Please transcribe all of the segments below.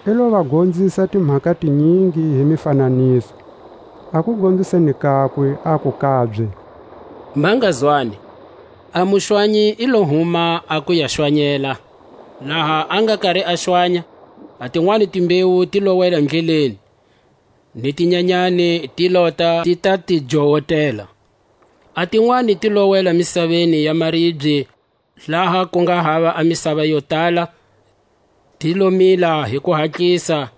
I lo va gonzisa timhaka tinyingi hi mifananiso; a kugonziseni kakwe aku kabye: Ma nga zwani: A muxwanyi i lo huma a ku ya xwanyela. Laha a nga kari a xwanya, a tinwani timbewu ti lo wela ndleleni, ni tinyanyani ti lota ti ta ti jowotela. A tinwani ti lo wela misaveni ya maribye, laha ku nga hava a misava yo tala; ti lo mila hi kuhatlisa, hilezi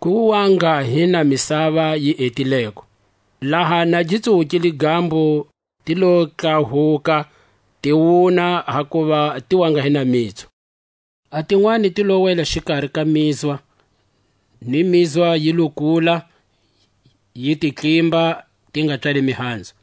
ku wa nga hi na misava yi etileko. Laha na gi tsuwukile gambo, ti lo tlahuka, ti wuna hakuva ti wa nga hi na mitsu. A tinwani ti lo wela xikari ka mizwa; ni mizwa yi lo kula, yi ti tlimba, ti nga pswali mihanzu.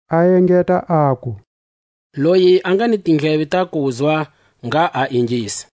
A engeta aku: Loyi a nga hi tindleve ta kuzwa, ngha a ingisa.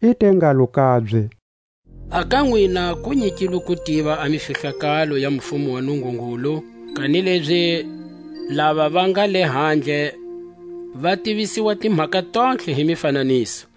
I te ngalo kabye: A ka nwina ku nyikilwe ku tiva a mifihlakalo ya mufumo wa Nungungulu; kanilezi lava va nga lehandle va tivisiwa timhaka tontlhe hi mifananiso;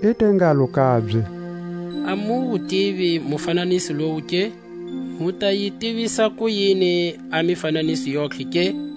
I te ngalo kabye: A mu wu tivi mufananiso lowu ke? Mu ta yi tivisa kuyini a mifananiso yontlhe ke?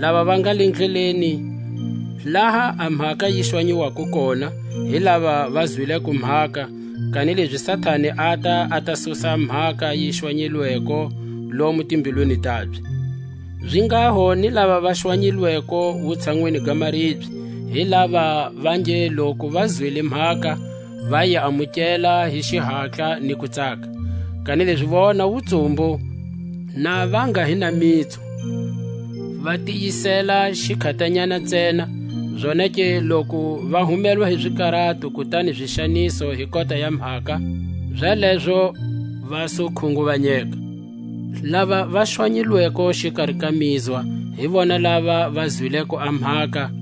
Lava va nga le ndleleni laha a mhaka yi xwanyiwako kona, hi lava va zwileko mhaka, kanilezi Satani ata, a ta susa a mhaka yi xwanyilweko lomo timbilwini tabye. Zinghaho ni lava va xwanyilweko wutshanwini ga maribye, hi lava va nge loku va zwile mhaka, va yi amukela hi xihatla ni kutsaka; kanilezi vona wutsumbu na va nga hi na mitsu, va tiyiseta xikhatanyana ntsena; zonake loku va humelwa hi zikarato kutani zixaniso hi kota ya mhaka, zalezo va su khunguvanyeka. Lava va xwanyilweko xikari ka mizwa, hi vona lava va zwileko a mhaka,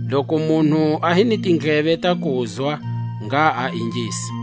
Loku munhu a hi ni tindleve ta kuzwa, ngha a ingisa.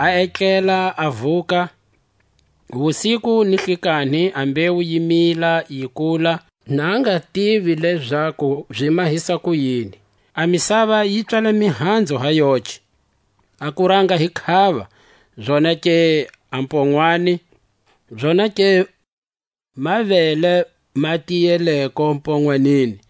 a etlela a vuka, wusiku ni hlikanhi a mbewu yi mila yi kula, na a nga zi tivi lezaku zi mahisa kuyini. A misava yi pswala mihanzu ha yoce: a kuranga hi khava, zonake a mponwani, zonake mavele ma tiyeleko mponwanini.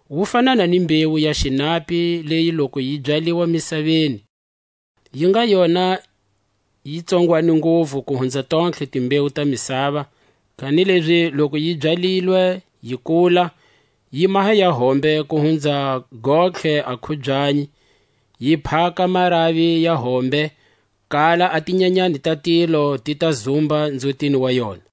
Wu fanana ni mbewu ya xinapi, leyi loku yi byaliwa misaveni, yi nga yona yi tsongwani nguvu ku hunza tontlhe timbewu ta misava, kanilezi loku yi byalilwe, yi kula, yi maha ya hombe ku hunza gontlhe a khubyanyi, yi phaka maravi ya hombe; kala a tinyanyani ta tilo ti ta zumba nzhutini wa yona.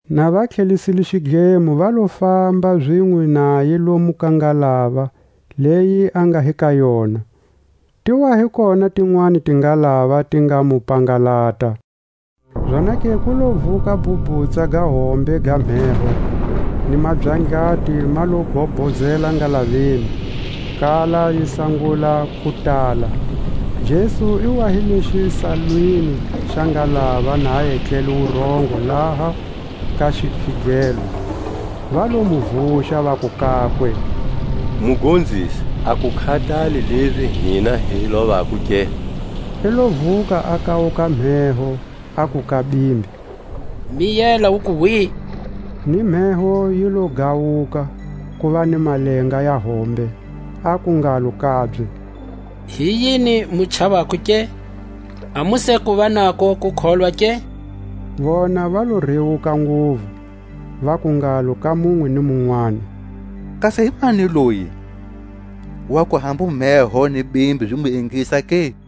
Na va tlhelisile xidlemo va lo famba zinwe naye lomu ka ngalava leyi a nga hi ka yona; ti wa hi kona tinwani tingalava ti nga mu pangalata. Zonake ku lo vuka a bhubhutsa ga hombe ga mheho, ni mabyandlati ma lo gobhozela ngalaveni, kala yi sangula ku tala. Jesu i wa hi le xisalwini xa ngalava na etlele wurongo laha ka zikhigelo. Va lo mu vuxa, vaku kakwe: Mugonzisi, a ku khatali lezi hina hi lovako ke? I lo vuka, a kawuka a mheho, aku ka bimbi: Miyela, uku hwi! Ni mheho yi lo gawuka, kuva ni malenga ya hombe. Aku ngalo kabye: Hi yini mu chavako ke? A mu se kuva nako kukholwa ke? Vona va lo rewuka nguvu, vaku ngalo ka munwe ni munwani: Kasi himani loyi, waku hambu mheho ni bimbi zi mu ingisa ke?